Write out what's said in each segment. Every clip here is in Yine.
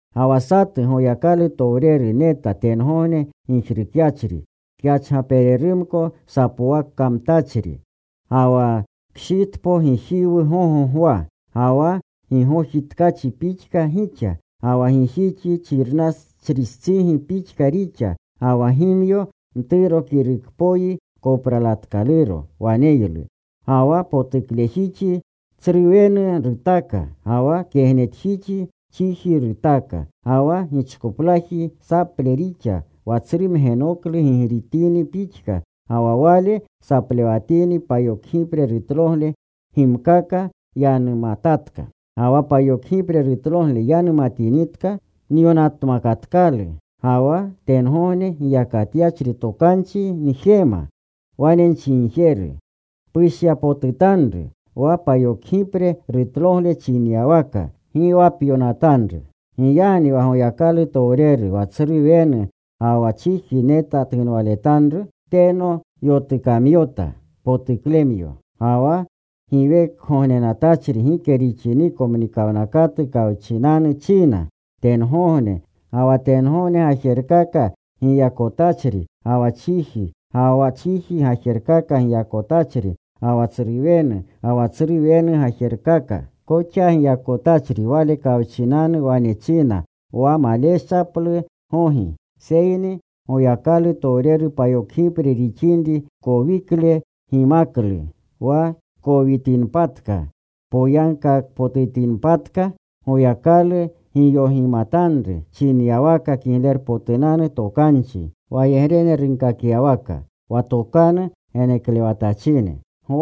Ga wa satu Goyakalutowreru neta, tengogne gijrukyachri. Kyachgapererumko sapowakamtachri. Ga wa kshitpo gijiwu gogo gwa. Ga wa gigoji tkachi pixka gixa. Ga wa gijixi xirnachristsigi pixka rixa. Ga wa gimyo mturo kirukpoyi kopralatkaluro waneylu. Ga wa potuklejixi tsruwenu rutaka. Ga wa kegnetjixi chiji rutaka. Ga wa gichkoplaji saple rixa, wa tsru mgenoklu gigritini pixka. Ga wa wale saplewatini, payokgipre rutlogle gimkaka yanumatatka. Ga wa payokgipre rutlogle yanumatinitka nyonatmakatkalu. Ga wa tengogne giyakatyachri tokanchi njema, wane nchinjeru, “Pushyapotutanru wa payokgipre rutlogle chinyawaka. Gi wa pyonatanru.” Giyagni wa Goyakalutowreru, wa tsru wenu ga wa chiji neta tunwaletanru, teno yotunomyota potuklemyo. Ga wa giwekgognenatachri gike rixiniko mnikawnakatu kawchinanu china. Tengogne ga wa tengogne gajerkaka giyakotachri, ga wa chiji ga wa chiji gajerkaka giyakotachri, ga wa tsru wenu ga wa tsru wenu gajerkaka koxa giyakotachri Wale kawchinanu wane china wa maleshaplu gogi. Seyni wa Goyakalutowreru payokgipre rixinri kowikle gimaklu, wa kowitinpatka, poyagkakpotutikolpatka Goyakalu giyogimatanru, chinyawaka Kiglerpotunanu Tokanchi, wayegrene runkakyawaka, wa tokanu geneklewatachine.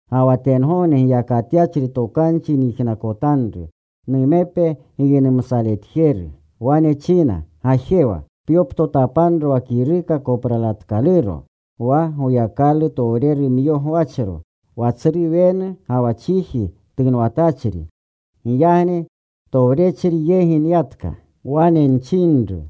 Ga wa tengogne giyakatyachri tokanchi nyijnakotanru, numepe giynumsaletjeru. Wane china, “Gajewa. Pyoptotapanro wa kiruka kopralatkaluro, wa Goyakalutowrerumyo gwachro, wa tsru wenu ga wa chiji tunwatachri.” Giyagni towrechri yegi nyatka. Wane nchinru,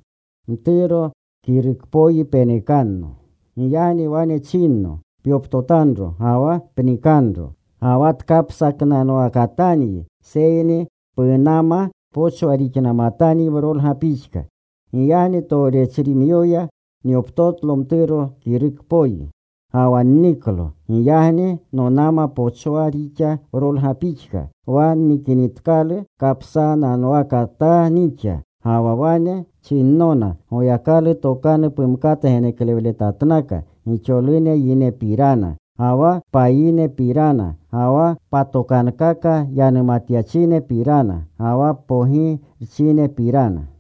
“Mturo kirukpoyi penekanno.” Giyagni wane chinno, “Pyoptotanro ga wa pnikanro. Ga wa tkapsatnanwakatanyi, seyni punama pochwaa rixnamatanyi wrolga pixka.” Giyagni towrechimyoya nyoptotlo mturo kirukpoyi. Ga wa nniklo. Giyagni nonama pochwaa rixa wrolga pixka. Wa nnikinitkalu, kapsananwakataa nixa. Ga wa wane chinnona, “Goyakalu tokanu pumkata geneklewletatnaka gixolune yinepirana, ga wa payinepirana, ga wa patokankaka yanumatyachinepirana, ga wa pogirchinepirana.”